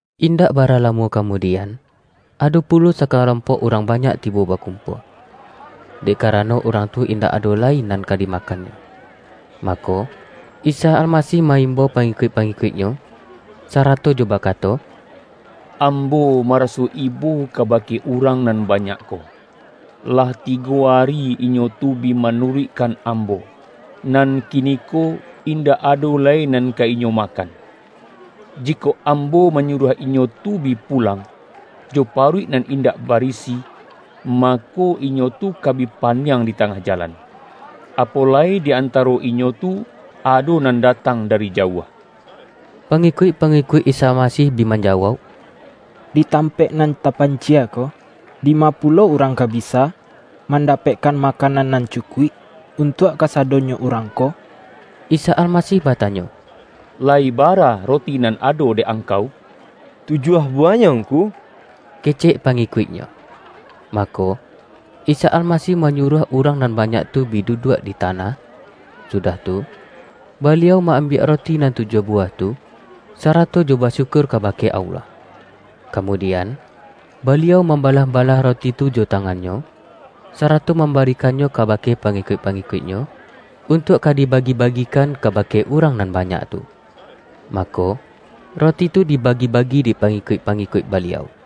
Indak bara lamo kamudian, ado pulo sakalompok urang banyak tibo bakumpua. Dek karano urang tu indak ado lai nan ka dimakannyo, mako, Isa Almasih ma-imbau pangi-kuik-pangikuik-Nyo, sarato jo baka-to, ”Ambo maraso ibo kabake urang nan banyak ko. Lah tigo ari inyo tu bi manuruikkan Ambo, nan kiniko indak ado lai nan ka inyo makan. Jikok Ambo manyuruah inyo tu bi pulang, jo paruik nan indak barisi, mako, inyo tu ka bi paniang di ta-ngah jalan. Apo lai di antaro inyo tu ado nan datang dari jauah.” Pangikuik-pangikuik Isa Almasih bi manjawauk,”Di tampaik nan tapan-cie ko, dima pulo urang ka bisa man-dapekkan makanan nan cukuik, un-tuak kasadonyo urang ko?” Isa Almasih batanyo,”Layi bara roti nan ado dek angkau?””Tujuah buwahnyo Ngku,” kecek pa-ngikuik-Nyo. Mako, Isa Almasih manyuruah urang nan banyak tu bi duduak di ta-nah, sudah tu, Baliau ma-ambiak roti nan tujuah buwah tu, sarato jo basyu-kur kabake Allah. Kamudian, Baliau mambalah-balah roti tu jo tangan-Nyo, sarato mambarikannyo kabake pangikuik-pangikuik-Nyo, untuak ka dibagi-bagikan kabake urang nan ba-nyak tu. Mako, roti tu dibagi-bagi dek pangikuik-pangikuik Baliau.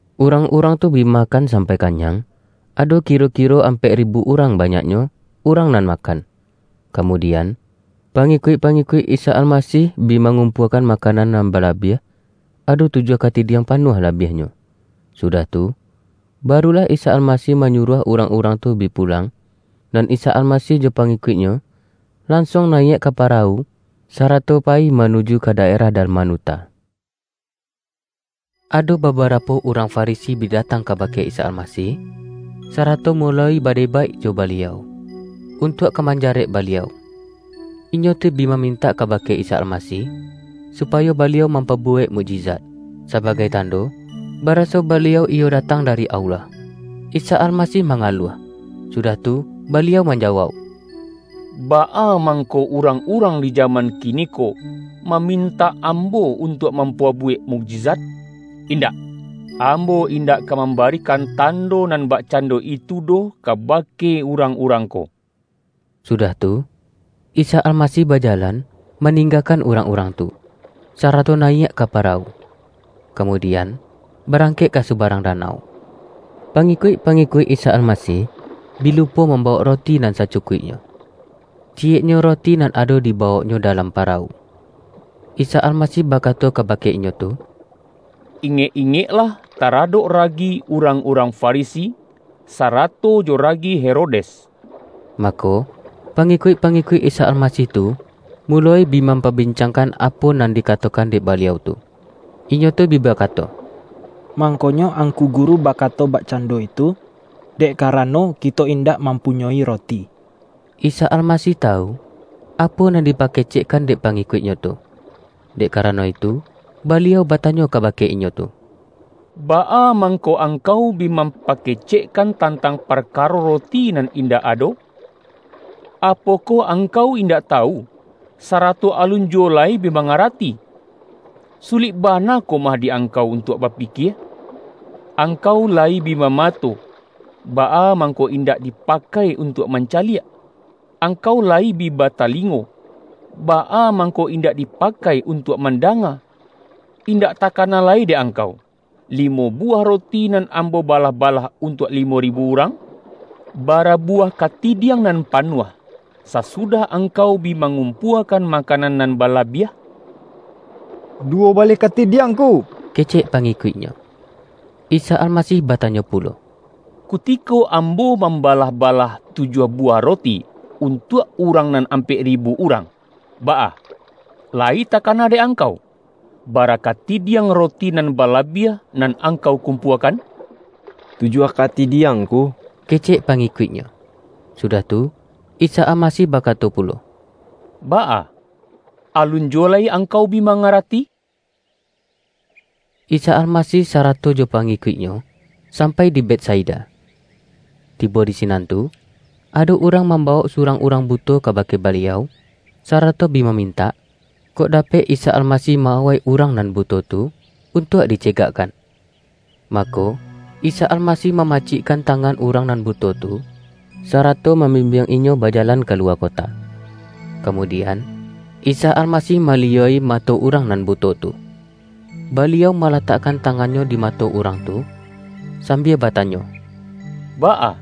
Urang-urang tu bi makan sampai ka-nyang — ado kiro-kiro ampek ribu urang banyaknyo, urang nan makan. Kamu-dian, pangikuik-pangikuik Isa Almasih bi mangumpuakan makanan nan bala-biah — ado tujuah katidiang panuah la-biahnyo. Sudah tu, barulah Isa Almasih manyuruah urang-urang tu bi pulang, nan Isa Almasih jo pangikuik-Nyo, lansuang nayiak ka parawu, sarato pa-yi manuju ka daerah Dalmanuta. Ado babarapo urang Farisi bi da-tang kabake Isa Almasih, sarato muloi badebaik jo Baliau, untuak ka manja-rek Baliau. Inyo tu bi mamintak kaha-ke Isa Almasih, supayo Baliau mampa-buwek mukjizat, sabagai tando baraso Baliau iyo datang dari Allah. Isa Almasih mangaluah, sudah tu Baliau manjawauk,”Baa mangko urang-urang di jaman kiniko, mamin-tak Ambo untuak mampabuwek muk-jizat? Indak! Ambo indak ka mam-barikan tando nan bakcando itu doh kabake urang-urang ko!” Sudah tu, Isa Almasih bajalan, maninggakan urang-urang tu, sara-to nayiak ka parawu; kamudian, ba-rangkek ka subarang danau. Pangikuik-pangikuik Isa Almasih, bi lupo mambawok roti nan sacukuik-nyo. Ciyeknyo roti nan ado dibawok-nyo dalam parawu. Isa Almasih ba-kato kabake inyo tu,”Ingek-ingeklah taradok ragi urang-urang Farisi, sara-to jo ragi Herodes.” Mako, pangikuik-pangikuik Isa Al-masih tu, muloi bi mampabincangkan apo nan dikatokan dek Baliau tu. Inyo tu bi bakato,”Mangkonyo Angku Gu-ru bakato bakcando itu, dek karano kito indak mampunyoi roti.” Isa Almasih tawu, apo nan dipa-kecekkan dek pangikuik-Nyo tu. Dek karano itu Baliau batanyo kabake inyo tu,”Baa mangko angkau bi mampake-cekkan tantang parkaro roti nan in-dak ado? Apokoh angkau indak tawu, sarato alun juwo lai bi mangarati? Su-lik bana komah di angkau untuak ba-pikie? Angkau layi bi bamato baa mangko indak dipakai untuak manca-liak? Angkau layi bi batalingo baa mangko indak dipakai untuak man-danga? Indak takana lai dek angkau, limo buwah roti, nan Ambo balah-balah untuak limo ribu urang? Bara buwah katidiang nan panuah, sasu-dah angkau bi mangumpuakan ma-kanan nan balabiah?””Duwo baleh katidiang Ngku,” ke-cek pangikuik-Nyo. Isa Almasih batanyo pulo,”Kuti-ko Ambo mambalah-balah tujuah bu-wah roti, untuak urang nan ampek ri-bu urang, baa, layi takana dek angkau, bara katidiang roti nan balabiah, nan angkau kumpuakan?””Tujuah katidiang Ngku,” kecek pa-ngikuik-Nyo. Sudah tu, Isa Almasih bakato pu-lo,”Baa, alun juwo lai angkau bi ma-ngarati?” Isa Almasih sarato jo pangikuik-Nyo, sampai di Betsaida. Tibo di sinan tu, ado urang mambawok surang urang buto kabake Baliau, sarato bi mamin-tak, kok dapek Isa Almasih ma-awai urang nan buto tu, untuak dicegak-kan. Mako, Isa Almasih mamacik-kan tangan urang nan buto tu, sarato mambimbiang inyo bajalan kaluwa ko-ta. Kamudian, Isa Almasih maliyua-i mato urang nan buto tu. Baliau mala-takkan tangan-Nyo di mato urang tu, sambia batanyo,”Baa,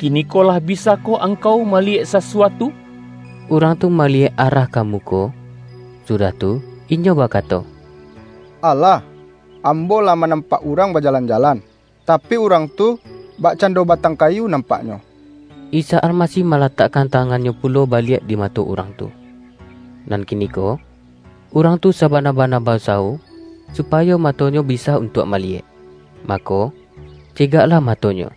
kiniko lah bisa-koh angkau maliyek sasuatu?” Urang tu maliyek arah ka muko, sudah tu inyo bakato,”Alah! Ambo lah manampak urang bajalan-jalan; tapi urang tu bakcando batang kayu nampaknyo.” Isa Almasih malatakkan tangan-Nyo pulo baliak di mato urang tu. Nan kiniko, urang tu sabana-bana ba-usawo supayo matonyo bisa untuak maliyek. Mako, cegaklah matonyo,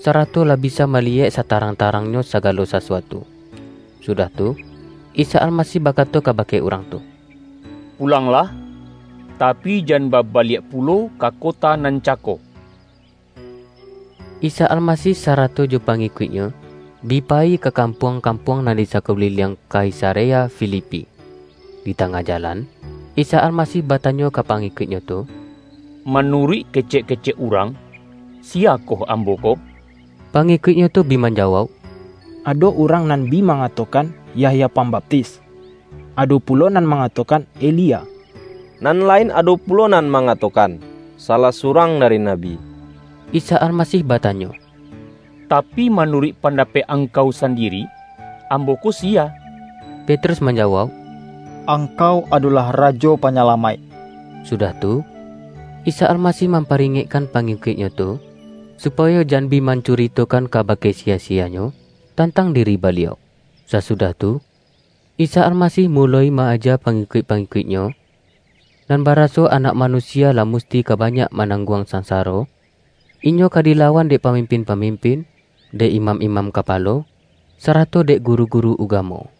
sarato lah bisa maliyek satarang-tarangnyo sa-galo sasuatu. Sudah tu, Isa Almasih bakato kabake urang tu,”Pulanglah, tapi, jan babaliak pulo ka kota nan cako.” Isa Almasih sarato jo pangikuik-Nyo bi payi ka kampuang-kampuang nan di sakuliliang Kaisarea Filipi. Di tangah jalan, Isa Almasih batanyo ka pangikuik-Nyo tu,”Manuruik kecek-kecek urang, siya koh Ambo ko?” Pangikuik-Nyo tu bi manjawauk,”Ado urang nan bi mangatokan: Yahya Pambaptis; ado pulo nan mangatokan Elia, nan lain ado pulo nan mangato-kan: salah surang dari nabi.” Isa Almasih batanyo,”Tapi, ma-nuruik pandapek angkau sandiri, Ambo ko siya?” Petrus manjawauk,”Angkau adolah Rajo Panyalamaik!” Sudah tu, Isa Almasih mampari-ngekkan pangikuik-Nyo tu, supayo jan bi mancuritokan kabake siya-siyanyo, tantang diri Baliau. Sasudah tu, Isa Almasih muloi ma-aja pangikuik-pangikuik-Nyo, nan baraso Anak Manusia lah musti ka banyak manangguang sansaro, Inyo ka dilawan dek pamimpin-pamim-pin, dek imam-imam kapalo, sarato dek guru-guru ugamo.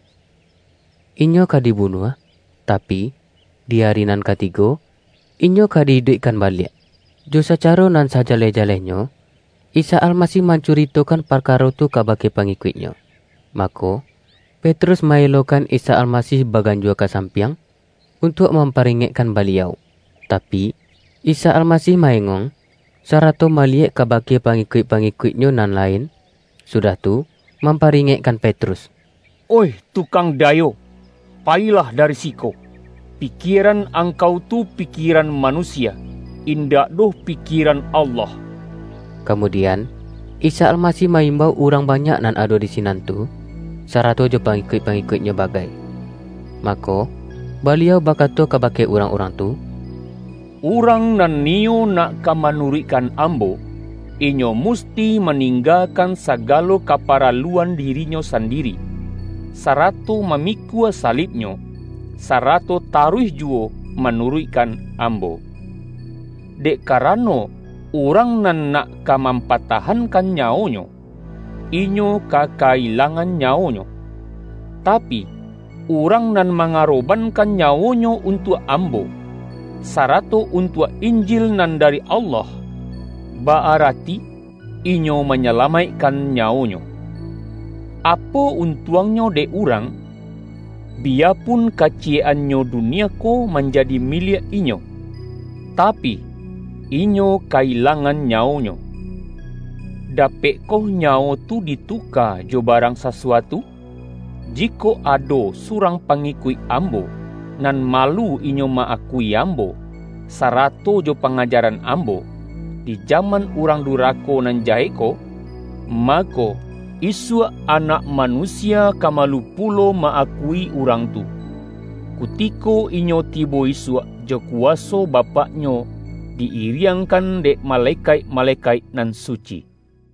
Inyo ka dibu-nuah, tapi, di ari nan katigo, Inyo ka di-iduikkan baliak. Jo sacaro nan sajaleh-jalehnyo, Isa Almasih mancuritokan parkaro tu kabake pangi-kuik-Nyo. Mako, Petrus ma-elokan Isa Almasih baganjua ka sampiang, untuak mamparingekkan Baliau. Tapi, Isa Almasih ma-engong, sarato maliyek kabake pangikuik-pangikuik-Nyo nan lain, sudah tu, mamparingekkan Petrus,”Oih Tu-kang Dayo! Payilah dari siko! Pikie-ran angkau tu pikieran manusia; in-dak doh pikieran Allah!” Kamudian, Isa Almasih ma-im-bau urang banyak nan ado di sinan tu, sarato jo pangikuik-pangikuik-Nyo bagai. Mako, Baliau bakato ka-bake urang-urang tu,”Urang nan niyo nak ka manuruikkan Ambo, inyo musti maninggakan sagalo kaparaluan dirinyo sandiri, sara-to mamikua salibnyo, sarato taruih juwo manuruikkan Ambo. Dek karano, urang nan nak ka mam-patahankan nyawonyo, inyo ka ka-ilangan nyawonyo. Tapi, urang nan mangarobankan nyawonyo un-tuak Ambo, sarato untuak Injil nan dari Allah, ba-arati inyo manya-lamaikkan nyawonyo. Apo un-tuangnyo dek urang, biyapun kaci-yek-annyo dunia ko manjadi miliak inyo, tapi, inyo ka-ilangan nyawonyo? Dapekkoh nyawo tu dituka jo ba-rang sasuatu? Jikok ado surang pangikuik Ambo, nan malu inyo ma-akui Ambo, sarato jo pangajaran Ambo, di ja-man urang durako nan jahek ko, mako, isuak Anak Manusia ka ma-lu pulo ma-akui urang tu, kutiko Inyo tibo isuak jo kuwaso Bapak-Nyo, di-iriangkan dek malekaik-ma-lekaik nan suci.”